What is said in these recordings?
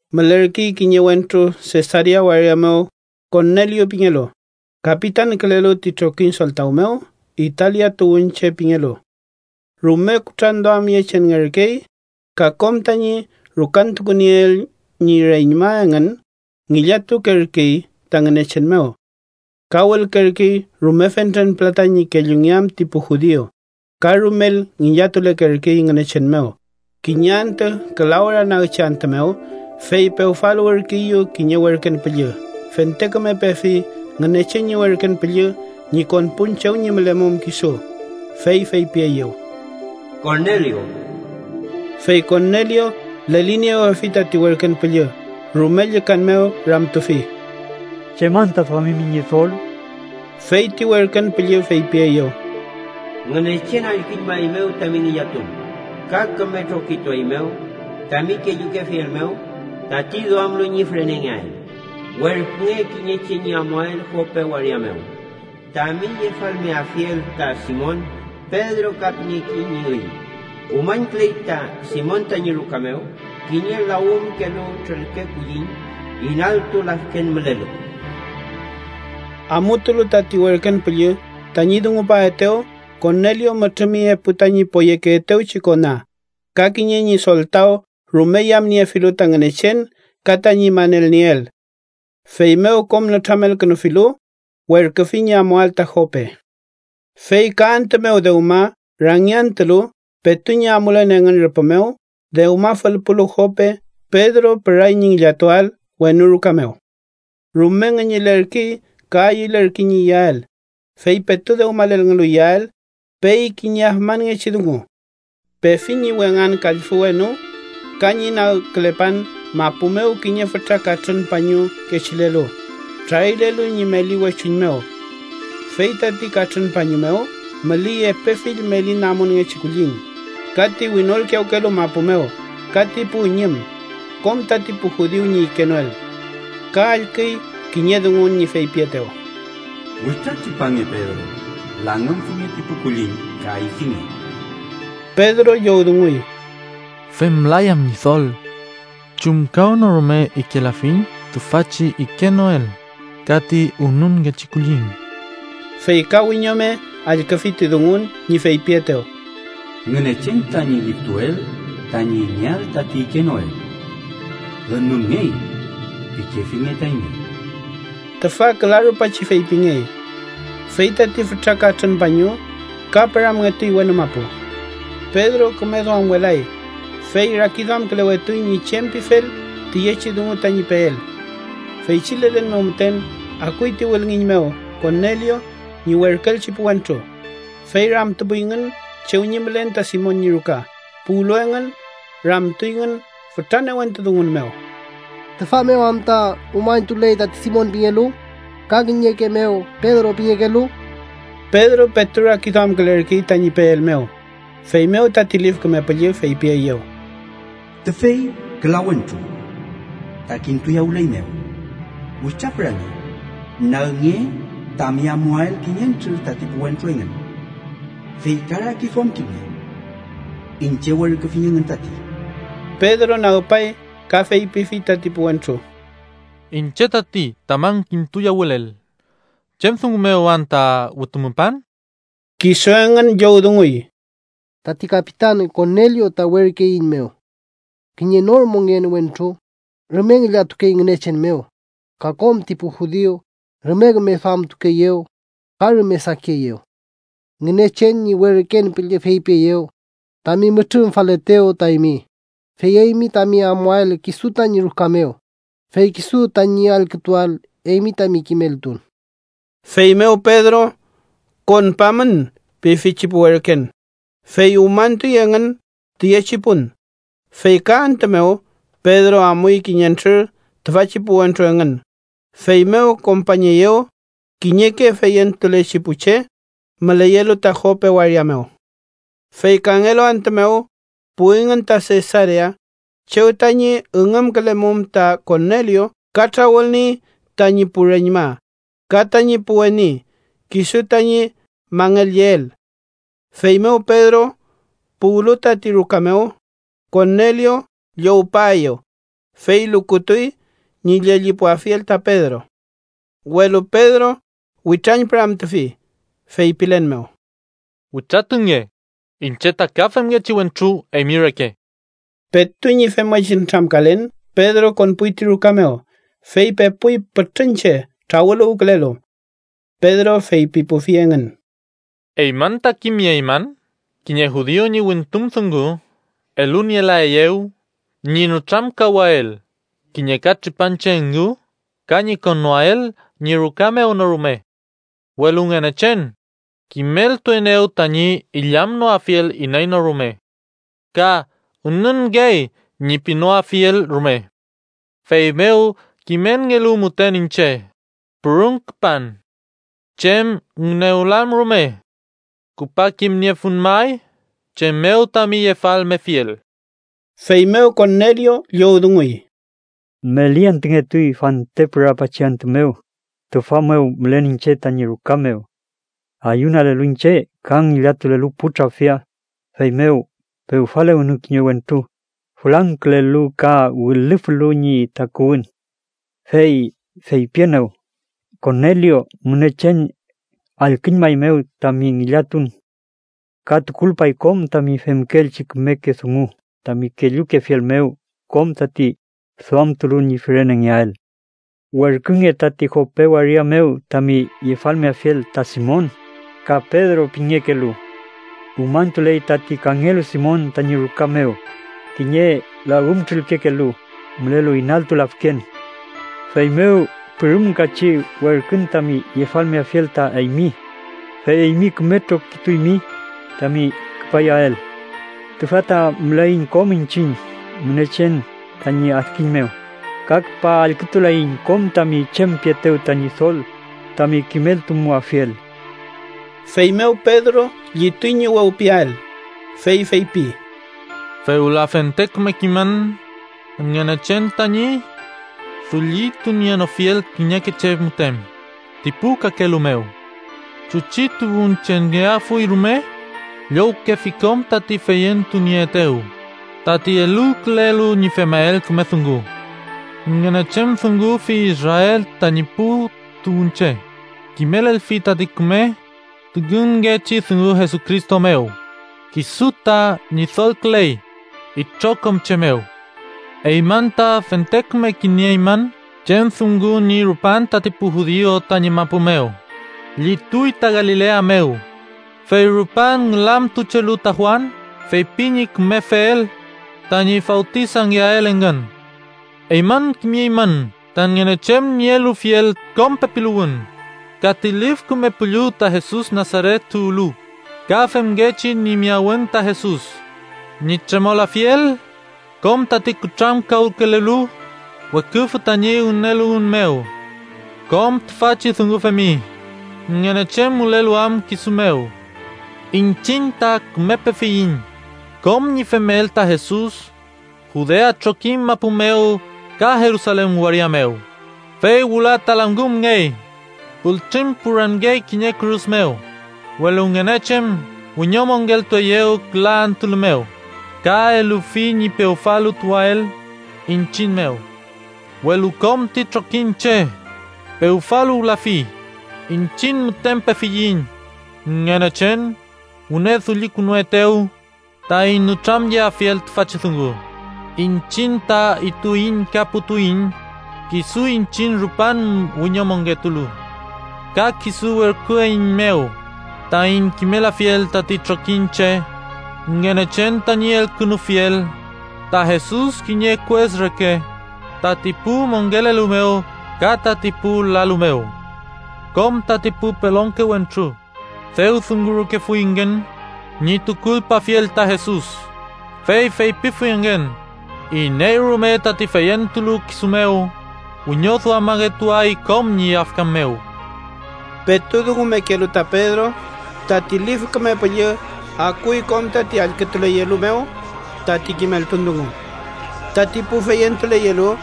Mülerkey kiñe wentru Sesarea waria mew Korneliu pingelu, kapitankülelu ti trokiñ soltaw mew Italia tuwünche pingelu. Rume kutranduamyechenngerkey, ka kom tañi rukantukunieel ñi reñma engün ngillatukerkey ta Ngünechen mew. Ka wülkerkey rume fentren pülata ñi kellungeam ti pu judiu, ka rumel ngillatulekerkey Ngünechen mew. Kiñe antü küla ora nagchi antü mew, fey pewfaluwürkeeyew kiñe werken püllü. Fente küme pefi Ngünechen ñi werken püllü ñi konpun chew ñi mülemum kisu, fey feypieyew: —¡Korneliu! Fey Korneliu leliniewefi tati werken püllü, rume llükan mew ramtufi: —¿Chem anta duamimi, Ñidol? Fey ti werken püllü feypieyew: —Ngünechen allküñmaeymew tami ngillatun ka küme trokitueymew tami kellukefiel mew tati duamlu ñi fürenengeael. Werkünge kiñe che ñi amuael Jope waria mew tami yefalmeafiel ta Simon, Pedro ka pingekey ñi üy. Umañküley ta Simon tañi ruka mew kiñe lawümkelu trülke kulliñ inaltu lafken mülelu. Amutulu tati werken püllü tañi dungupaetew, Korneliu mütrümi epu tañi poyekeetewchi kona ka kiñe ñi soltaw rume yamniefilu ta Ngünechen ka tañi manelnieel. Feymew kom nütramelkünufilu, werküfi ñi amuael ta Jope. Fey ka antü mew, dewma rangiantülu, petu ñi amulen engün rüpü mew, dewma fülpulu Jope, Pedro püray ñi ngillatuael wenu ruka mew. Rume ngüñülerkey ka ayülerkey ñi iyael, fey petu dewmalelngelu iyael, pey kiñe afmanngechi dungu: Pefi ñi wengan kallfü wenu ka ñi nagkülepan mapu mew kiñe fütra katrün pañu kechilelu, trarilelu ñi meli wechuñ mew. Fey tati katrün pañu mew müley epe fill meli namunngechi kulliñ ka ti winolkiyawkelu mapu mew ka ti pu üñüm, kom tati pu judiu ñi ikenoel. Ka allküy kiñe dungun ñi feypietew: —Witratripange, Pedro. Langümfinge ti pu kulliñ ka ifinge. Pedro llowdunguy: —Femlayan, Ñidol. Chumkawnorume ikelafiñ tüfachi ikenoel ka ti ünunngechi kulliñ. Fey ka wiñome allküfi ti dungun ñi feypietew: —Ngünechen tañi liftuel tañi ingeael tati ikenoel ‘ünunngey’ pikefilnge ta eymi. Tüfa küla rupachi feypingey, fey tati fütra katrün pañu ka püramngetuy wenu mapu. Pedro küme duamwelay, fey rakiduamkülewetuy ñi chem pifel tiyechi dungu tañi peel. Feychi lelen mew müten akuy ti wülngiñ mew Korneliu ñi werküelchi pu wentru, fey ramtupuyngün chew ñi mülen ta Simon ñi ruka. Puwlu engün, ramtuyngün fütra newentu dungun mew: —¿Tüfa mew anta umañtuley tati Simon pingelu, ka kiñeke mew Pedro pingekelu? Pedro petu rakiduamkülerkey tañi peel mew, feymew tati Lif Küme Püllü feypieyew: —Tüfey, küla wentru ta kintuyawüleymew. Witratripange, nagnge tami amuael kiñentrür tati pu wentru engün, fey ka rakiduamkilnge. Iñche werküfiñ engün tati. Pedro nagpay ka feypifi tati pu wentru: —Iñche tati tamün kintuyawülel. ¿Chem dungu mew anta wütumupan? Kisu engün llowdunguy: —Tati kapitan Korneliu ta werküeiñmew, kiñe nor mongen wentru, rume ngillatukey Ngünechen mew, ka kom ti pu judiu rume küme duamtukeeyew ka rume sakieyew. Ngünechen ñi werken püllü feypieyew tami mütrümfalaetew ta eymi, fey eymi tami amuael kisu tañi ruka mew, fey kisu tañi allkütuael eymi tami kimeltun. Feymew Pedro “konpamün” pifi ti pu werken, fey umañtuy engün tüyechi pun. Fey ka antü mew, Pedro amuy kiñentrür tüfachi pu wentru engün, feymew kompañeyew kiñeke feyentulechi pu che müleyelu ta Jope waria mew. Fey kangelu antü mew, puwingün ta Sesarea chew tañi üngümkülemum ta Korneliu ka trawülniey tañi pu reñma ka tañi pu weni kisu tañi mangelyeel. Feymew Pedro puwlu tati ruka mew, Korneliu llowpaeyew, fey lukutuy ñi llellipuafiel ta Pedro. Welu Pedro witrañpüramtufi, feypilen mew: —Witratunge, iñche ta ka femngechi wentru eymi reke. Petu ñi femngechi nütramkalen, Pedro konpuy ti ruka mew, fey pepuy pütrün che trawüluwkülelu. Pedro feypipufi engün: —Eymün ta kimnieymün kiñe judiu ñi wimtun dungu elunielaeyew ñi nütramkawael kiñe katripanche engu ka ñi konnoael ñi ruka mew no rume. Welu Ngünechen kimeltuenew tañi illamnoafiel iney no rume ka ‘ünunngey’ ñi pinoafiel rume. Feymew, kimelngelu müten iñche, pürüm küpan. Chem ngünewlan rume. Küpa kimniefun may chem mew tami yefalmefiel. Feymew Korneliu llowdunguy: —Meli antüngetuy, fante pürapachi antü mew, tüfa mew mülen iñche tañi ruka mew. Ayunalelu iñche ka ngillatulelu pu trafia, feymew pewfaluwenew kiñe wentru fülangkülelu ka wilüflu ñi takuwün. Fey feypienew: ‘Korneliu, Ngünechen allküñmaeymew tami ngillatun ka tukulpay kom tami femkeelchi kümeke dungu tami kellukefiel mew kom tati duamtulu ñi fürenengeael. Werkünge tati Jope waria mew tami yefalmeafiel ta Simon, ka Pedro pingekelu. Umañtuley tati kangelu Simon tañi ruka mew, kiñe lawümtrülkekelu mülelu inaltu lafken.’ Feymew pürümkachi werkün tami yefalmeafiel ta eymi, fey eymi küme trokituymi tami küpayael. Tüfa ta müleiñ kom iñchiñ Ngünechen tañi adkiñ mew, ka küpa allkütuleiñ kom tami chem pietew ta Ñidol tami kimeltumuafiel. Feymew Pedro llituy ñi wewpiael, fey feypi: “Fewla fente küme kimün Ngünechen tañi dullitunienofiel kiñeke che müten ti pu kakelu mew. Chuchi tuwünchengeafuy rume, llowkefi kom tati feyentunieetew tati eluwkülelu ñi femael küme dungu. Ngünechen dungufi Israel tañi pu tuwünche, kimelelfi tati küme tüngünngechi dungu Jesucristo mew, kisu ta Ñidolküley itrokom che mew. Eymün ta fente küme kimnieymün chem dungu ñi rupan tati pu judiu tañi mapu mew. Llituy ta Galilea mew, fey rupan ngülamtuchelu ta Juan feypi ñi kümefel tañi fawtisangeael engün. Eymün kimimün ta Ngünechen ñi elufiel kom pepiluwün ka ti Lif Küme Püllü ta Jesus Nasaret tuwlu, ka femngechi ñi miyawün ta Jesus ñi tremolafiel kom tati kutrankawkülelu weküfü tañi ngüneluwün mew. Kom tüfachi dungu femi, Ngünechen mülelu am kisu mew. “Iñchiñ ta küme pefiyiñ kom ñi femel ta Jesus Judea trokiñ mapu mew ka Jerusalen waria mew. Fey wüla ta langümngey, pültrüñpüramngey kiñe kürus mew. Welu Ngünechen wiñomongeltueyew küla antülu mew, ka elufi ñi pewfaluwtuael iñchiñ mew. Welu kom ti trokiñche pewfaluwlafi, iñchiñ müten pefiyiñ, Ngünechen wüne dullikünuetew taiñ nütramyeafiel tüfachi dungu. Iñchiñ ta ituiñ ka putuiñ kisu iñchiñ rupan wiñomongetulu. Ka kisu werküeiñmew taiñ kimelafiel tati trokiñche Ngünechen tañi elkünufiel ta Jesus kiñe kues reke tati pu mongelelu mew ka tati pu lalu mew. Kom tati pu pelonke wentru dew dungurkefuyngün ñi tukulpafiel ta Jesus, fey feypifuyngün: ‘iney rume tati feyentulu kisu mew wiñoduamangetuay kom ñi yafkan mew.’” Petu dungumekelu ta Pedro, tati Lif Küme Püllü akuy kom tati allkütuleyelu mew tati kimeltun dungu. Tati pu feyentuleyelu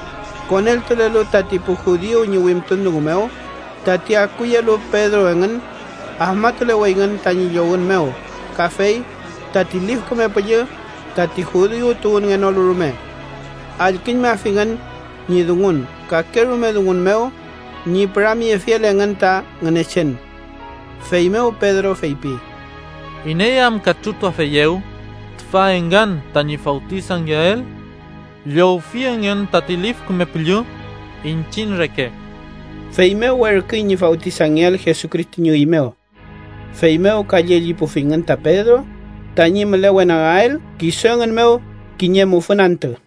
konkülelu tati pu judiu ñi wimtun dungu mew tati akuyelu Pedro engün, afmatuleweyngün tañi llowün mew kafey tati Lif Küme Püllü tati pu judiu tuwünngenolu rume. Allküñmafingün ñi dungun kake rume dungun mew ñi püramyefiel engün ta Ngünechen. Feymew Pedro feypi: “¿Iney am katrütuafeyew tüfa engün tañi fawtisangeael? Llowfi engün tati Lif Küme Püllü iñchiñ reke.” Feymew werküy ñi fawtisangeael Jesucristo ñi üy mew. Feymew ka llellipufingün ta Pedro tañi mülewenagael kisu engün mew kiñe mufün antü.